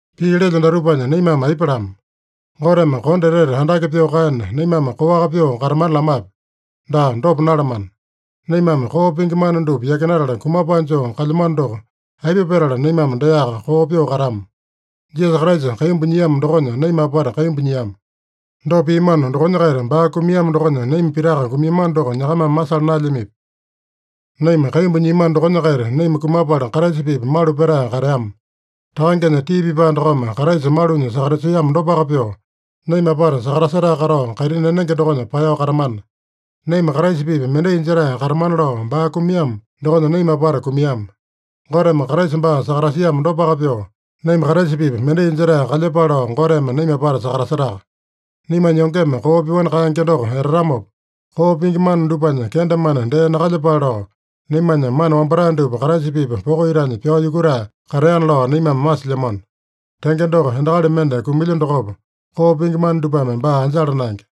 Pii lelyo datupanya naimame aipa lama? Goteme kondo etete andake pyoo kaena, naimame koaka pyoo katamana lamape? Daa, dopa nalamana! Naimame koo pingi mana dupa yakinatala kumapae joo kalyamano doko, aipa petala naimame deaka koo pyoo katama? Jisasa Kraisa kaimbu nyiamo dokonya naima apata kaimbu nyiama. Dopa piamano dokonya-kaita, baa kumiamo dokonya naima pitaka kumiamano doko nyakamame masala naelyamipi? Naima kaimbu nyiamano dokonya-kaita naima kumapala Kraisa-pipa malu petae kateama. Takangenya tii pipae dokome Kraisa malunya sakatasiamo dopaka pyoo, naima apata sakatasetae katao, kaitini enenge dokonya paeyao katamana. Naima Kraisa-pipa mendai jetae katamana lao baa kumiamo dokonya naima apata kumiama. Goteme Kraisa baa sakatasiamo dopaka pyoo, naima Kraisa-pipa mendai jetae kalyepale lao Goteme naima apata sakatasetaka. Naimanya yongeme koo pyoani kaenge doko etatamopa, koo pingi mana dupanya kendemane dee nakalyepale lao, naimanya mana wambatae dupa Kraisa-pipa poko itanya pyao yukutae kateana lao naimame masilyamano. Tenge doko, endakali mende kumilya dokopa, koo pingi mana dupame baa anjala naenge.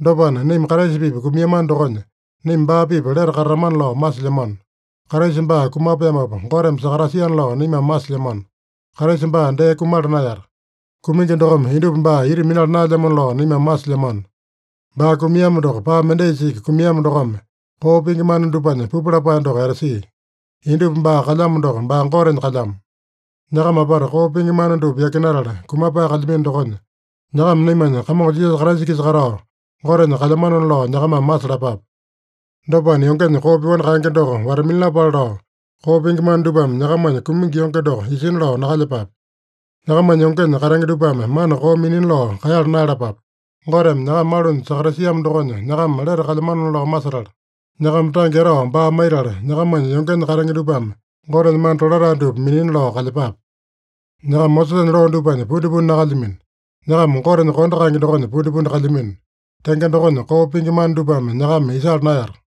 Dopana, naima Kraisa-pipa kumiamano dokonya, naima baa-pipa lete katatamana lao masilyamano. Kraisa baa kumapeamopa, Goteme sakatasiana lao naimame masilyamano. Kraisa baa dee kumala naeyata. Kumingi dokome indupa baa ita minala naelyamona lao naimame masilyamano. Baa kumiamo doko, paa mendaisa iki kumiamo dokome, koo pingi mana dupanya pupu lapae doko etasia. Indupa baa kalyamo doko, baa Gotenya kalyamo. Nyakama apata koo pingi mana dupa yakinatala, kumapae kalyamino dokonya, nyakama naimanya Kamongo Jisasa Kraisa-kisa katao, Gotenya kalyamanona lao nyakamame masalapape. Dopana, yongenya koo pyoani kaenge doko wata-minalapale lao, koo pingi mana dupame nyakamanya kumingi yonge doko isina lao nakalyepape. Nyakamanya yongenya katenge dupame mana koo minina lao kaeyala naeyalapape. Goteme nyakama malunya sakatasiamo dokonya nyakama lete kalyamanona lao masetala, nyakama tange etao baa maitala, nyakamanya yongenya katenge dupame Gotenya mana tolatae dupa minina lao kalyepape. Nyakama Mosesanya loo dupanya pundipundi nakalyamino. Nyakama Gotenya kondo kaenge dokonya pundipundi kalyamino. Tenge dokonya, koo pingi mana dupame nyakama isala naeyata.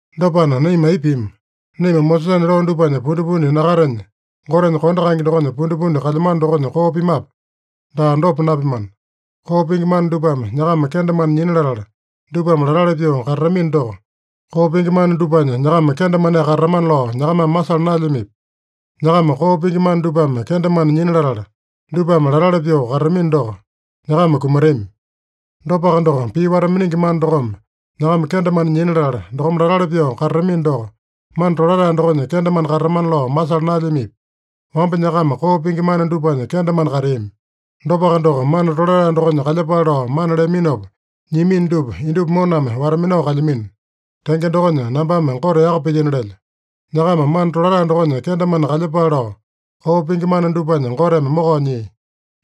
Dopana, naima aipa pima? Naima Mosesanya loo dupanya pundipundi nakatenya, Gotenya kondo kaenge dokonya pundipundi kalyamano dokonya koo pimape? Daa, dopa napimana! Koo pingi mana dupame nyakama kendemane nyina latala, dupame latali pyoo katatamino doko, koo pingi mana dupanya nyakama kendemaneaka katatamana lao nyakamame masala naelyamipi? Nyakama koo pingi mana dupame kendemane nyina latala, dupame latali pyoo katatamino doko, nyakama kumatami. Dopaka doko, pii wata-miningi mana dokome nyakama kendemane nyina latala, dokome latali pyoo katatamino doko, mana tolatae dokonya kendemane katatamana lao masala naelyamipi? Wamba nyakama koo pingi mana dupanya kendemane kateami. Dopaka doko, mana tolatae dokonya kalyepale lao mana leaminopa nyiamino dupa, indupa moname wata-minao kalyamino. Tenge dokonya, nambame Gote yaka pilyino lelyo. Nyakama mana tolatae dokonya kendemane kalyepale lao, koo pingi mana dupanya Goteme mokao nyia.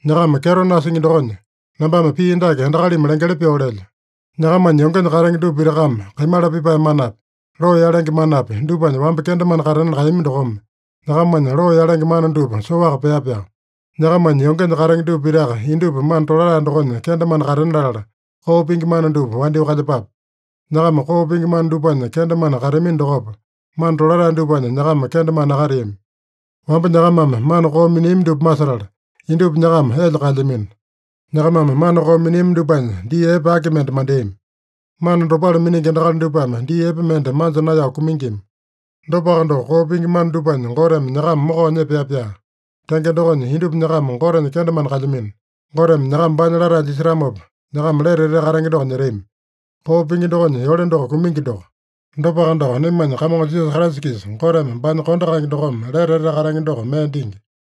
Nyakama kyeto nasingi dokonya, nambame pii dake endakalimi lengeli pyoo lelyo: Nyakamanya yongenya katenge dupa pitakame kaimala pipae manapi, loo yalenge manapi, dupanya wamba kendemane katena kaeyami dokome, nyakamanya loo yalenge mana dupa soaka pea-pyaa. Nyakamanya yongenya katenge dupa pitaka indupa mana tolatae dokonya kendemane katena latala, koo pingi mana dupa wandyoo kalyepape. Nyakama koo pingi mana dupanya kendemane kateamino dokopa, mana tolatae dupanya nyakama kendemane nakateami. Wamba nyakamame mana koo miniami dupa masetala, indupa nyakama elya kaelyamino. Nyakamame mana koo miniami dupanya dii epe aki mende mandeami? Mana dopale miningi endakali dupame dii epe mende manja naeyao kumingima. Dopaka doko, koo pingi mana dupanya Goteme nyakama mokao nyepea-pyaa. Tenge dokonya, indupa nyakama Gotenya kendemane kalyamino. Goteme nyakama baanya latae jisetamopa, nyakama lete etete katenge doko nyetami. Koo pingi dokonya yole doko kumingi doko. Dopaka doko, naimanya Kamongo Jisasa Kraisa-kisa Goteme baanya kondo kaenge dokome lete etete katenge doko mee dingi.